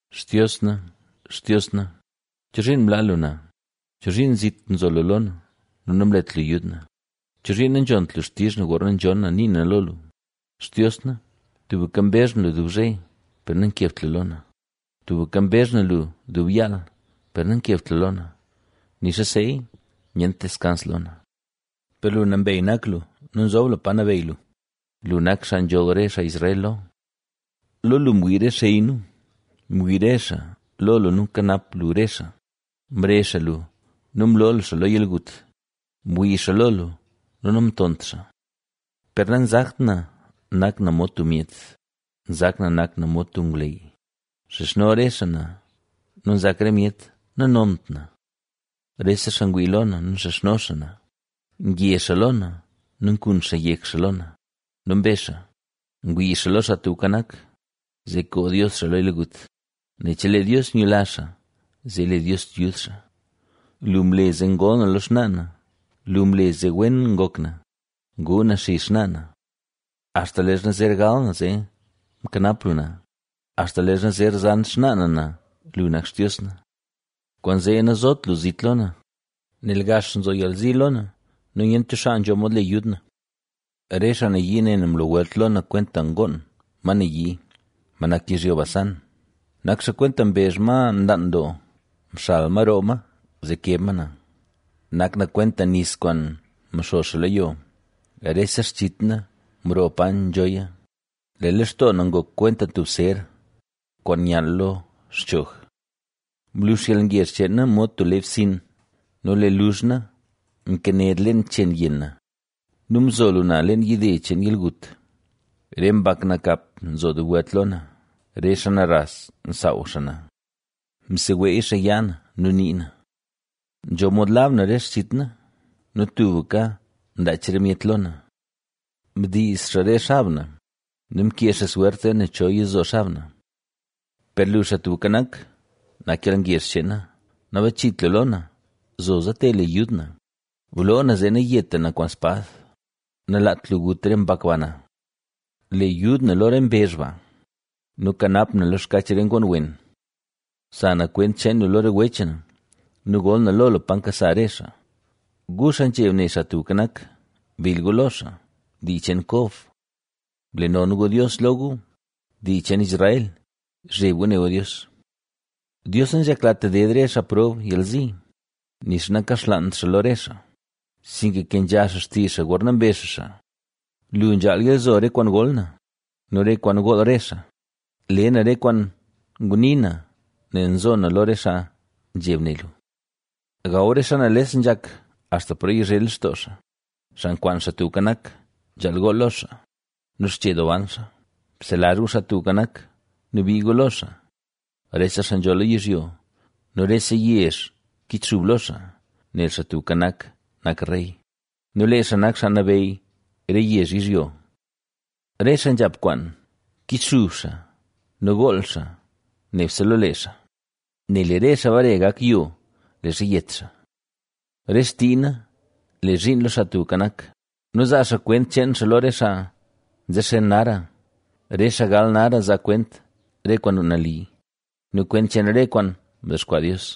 Xtios na, Xtios na, ¿chozhiin mlaa lu na? ¿Chozhiin zit nzo lu lo na nu nanlet lu yud na? ¿Chozhiin nanzhont lu xtizh na gorna nzhonn na nii na lo lu? Xtios na, tubka mbezh na lu dub zhe per nankebt lu lo na; tubka mbezh na lu dub yaal per nankebt lu lo na nixa seeya nyent deskans lo na. Per lu nambey nak lu nu nzob lu pa nabeyy lu; lu nak xaa nzholl re xaa Israel lo. Lo lu mwii re xey nu; mwii re xaa lo lu nu mkanap lu re xaa, Mrezh xaa lu nu mloo lu xaa lo yalgut; mwii xaa lo lu nu namtont xaa. Per nanzakt na nak na mod tub myet, nzak na nak na mod tub ngwley, ma nax lo yo. Nxizhno re xaa na nu nzak re myet nanont na. Rese xaa ngwii lo na nu nxizhno xaa na; nge xaa lo na nu nkun xaa yek xaa lo na nu mbezh xaa: “¡Ngwii xaa lo Xaa Tubka Nak, zee koo Dios xaa lo yalgut, nel chelee Dios nyula xaa, zee le Dios yud xaa!” Lu mle zee ngol na lo xnaa na; lu mle zee wen ngok na, nguu na xizh xnaa na. Axta leezha zer gal na zee mkanap lu na, axta leezha zer zan xnaa na na, lu nak Xtios na. Kwaanzee nazot lu zit lo na, nel gax nzo yalzi lo na, nu nyent cho xaa nzho mod le yud na. Re xaa nayii ne na mlo welt lo na kwenta ngoon, ma nayii, ma nak yizhyo Basán. Nak xaa kwenta mbezh ma nlaan doo, mxal ma roo ma zee keb ma na. Nak na kwenta nis kwaan mxo xaa lo yo, rese xchit na mroo pa nzhoya, lee lextoo na ngok kwenta tub ser, kwaan nyall lo xchoog. Mlux yalngezh cheen na mod tub lee bsinn, nu lee luzh na mkened leen chenn yenn na; nu mzo lu na leen yide cheen yalgut. Re mbak nakap nzo dub welt lo na; re xaa naras nsaaw xaa na, mseweey xaa yaa na nu nii na. Nzho mod lab na re xchit na nu tubka nlaach re myet lo na. Mdiiz xaa re xab na nu mkee xaa swert zee ne cho yizo xab na. Per lu, Xaa Tubka Nak, nak yalngezh cheen na, nabachit lu lo na, zoza te le yud na, bloo na zee nayeta na kwaan spad, nalaat lu gut re mbak ba na. Le yud na lo re mbezh ba, nu kanap na lo xkach re ngoon wen. Za na kwent cheen lu lo re wech na nu gol na lo lu pa nkasa re xaa. Gu, xaa nzheb ne Xaa Tubka Nak, bill gu lo xaa, dii cheen Kob, ble non gu Dios lo gu, dii cheen Israel, bzheb gu ne gu Dios. Dios nanzheklat ded re xaa prob yalzi, nixa nakaxlaant xaa lo re xaa, sinka nkenzha xaa xtizh xaa gorna mbezh xaa xaa. Lu nzhaal yalzo re kwaan gol na, nu re kwaan gool re xaa, le na re kwaan nguni na nel nzo na lo re xaa nzheb ne lu. Gaw re xaa nales nzhak axta paro yizhe lextoo xaa, xaa nkwaan Xaa Tubka Nak, nzhaal gool lo xaa, nu xche doo ban xaa. Bselazh gu Xaa Tubka Nak, nu bii gu lo xaa, rese xaa nzho lo yizhyo, nu rese yezh kichxub lo xaa, nel Xaa Tubka Nak nak rey nu lee xaa nak xaa nabeyy re yezh yizhyo. Re xaa nzhap kwaan, kichxub xaa nu gool xaa nebse lo lee xaa, nel lee re xaa bare gak yo, leezha yet xaa. Re xtii na le zhiin lo Xaa Tubka Nak nu zaa xaa kwent cheen xaa lo re xaa nzexen nara, re xaa gal nara zaa kwent re kwaan nali, nu kwent cheen re kwaan mdexkwaa Dios.